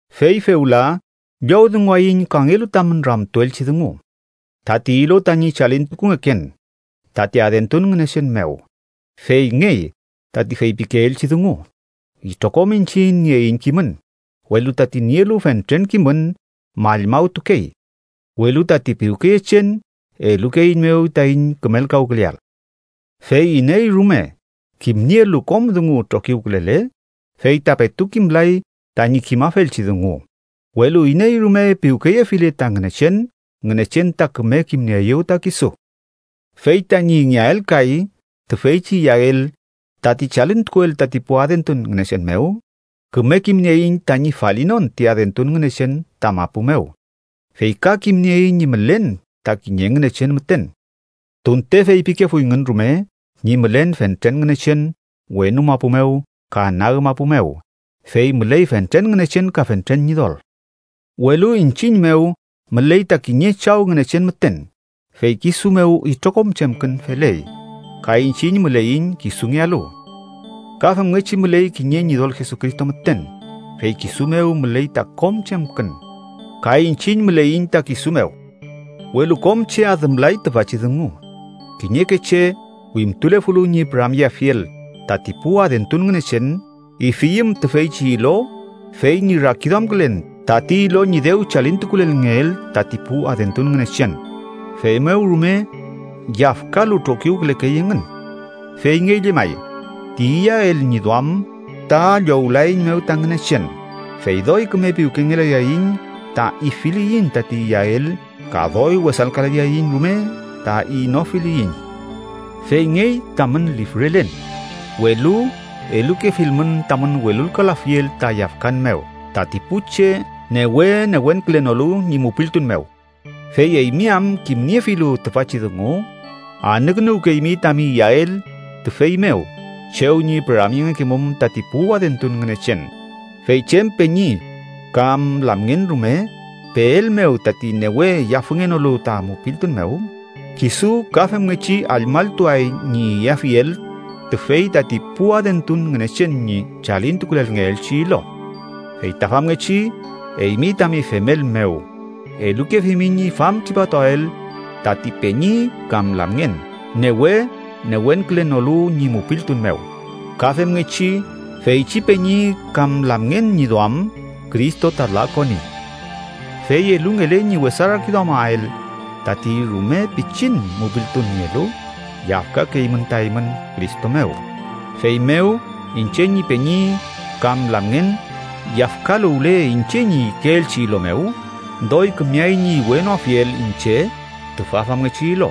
Fey fewla llowdunguwayiñ kangelu tamün ramtuelchi dungu tati ilo tañi chalintukungeken tati adentun ngünechen mew. Feyngey tati feypikeelchi dungu: Itrokom iñchiñ nieiñ kimün, welu tati nielu fentren kimün mallmawtukey, welu tati piwkeyechen elukeeiñmew taiñ kümelkawküleael. Fey iney rume kimnielu kom dungu trokiwkülele, fey ta petu kimlay tañi kimafelchi dungu. Welu iney rume piwkeyefile ta Ngünechen, Ngünechen ta küme kimnieeyew ta kisu. Fey tañi ingeael kay tüfeychi iyael tati chalintukuel tati pu adentun ngünechen mew, küme kimnieiñ tañi falinon ti adentun ngünechen ta mapu mew, fey ka kimnieiñ ñi mülen ta kiñe Ngünechen müten. Tunte feypikefuyngün rume ñi mülen fentren ngünechen wenu mapu mew ka nag mapu mew (fey müley fentren ngünechen ka fentren ñidol), welu iñchiñ mew müley ta kiñe Chaw Ngünechen müten, fey kisu mew itrokom chemkün feley, ka iñchiñ müleiñ kisungealu. Ka femngechi müley kiñe Ñidol Jesucristo müten, fey kisu mew müley ta kom chemkün, ka iñchiñ müleiñ ta kisu mew. Welu kom che adümlay tüfachi dungu. Kiñeke che, wimtulefulu ñi püramyeafiel tati pu adentun ngünechen, ifiyüm tüfeychi ilo fey ñi rakiduamkülen tati ilo ñi dew chalintukulelngeel tati pu adentun ngünechen, feymew rume yafkalu trokiwkülekey engün. Feyngey llemay ti iyael ñi duam ta llowlaeiñmew ta Ngünechen, fey doy küme piwkengelayaiñ ta ifiliyiñ tati iyael, ka doy wesalkalayaiñ rume ta inofiliyiñ. Feyngey tamün lifrelen, welu elukefilmün tamün welulkalafiel ta yafkan mew tati pu che newe newenkülenolu ñi mupiltun mew. Fey eymi am, kimniefilu tüfachi dungu, anükünuwkeymi tami iyael tüfey mew chew ñi püramyengekemum tati pu adentun ngünechen, fey chem peñi kam lamngen rume peelmew tati newe yafüngenolu ta mupiltun mew, kisu ka femngechi allmalltuay ñi iyafiel tüfey tati pu adentun ngünechen ñi chalintukulelngeelchi ilo. Fey ta famngechi eymi tami femel mew, elukefimi ñi famtripatuael tati peñi kam lamngen newe newenkülenolu ñi mupiltun mew. Ka femngechi feychi peñi kam lamngen ñi duam Cristo ta lakoni. Fey elungele ñi wesa rakiduamael tati rume pichin mupiltun nielu, yafkakeymün ta eymün Cristo mew. Feymew, iñche ñi peñi kam lamngen yafkaluwle iñche ñi ikeelchi ilo mew, doy kümeay ñi iwenoafiel iñche tüfa famngechi ilo,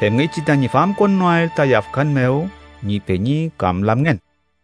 femngechi tañi famkonnoael ta yafkan mew ñi peñi kam lamngen.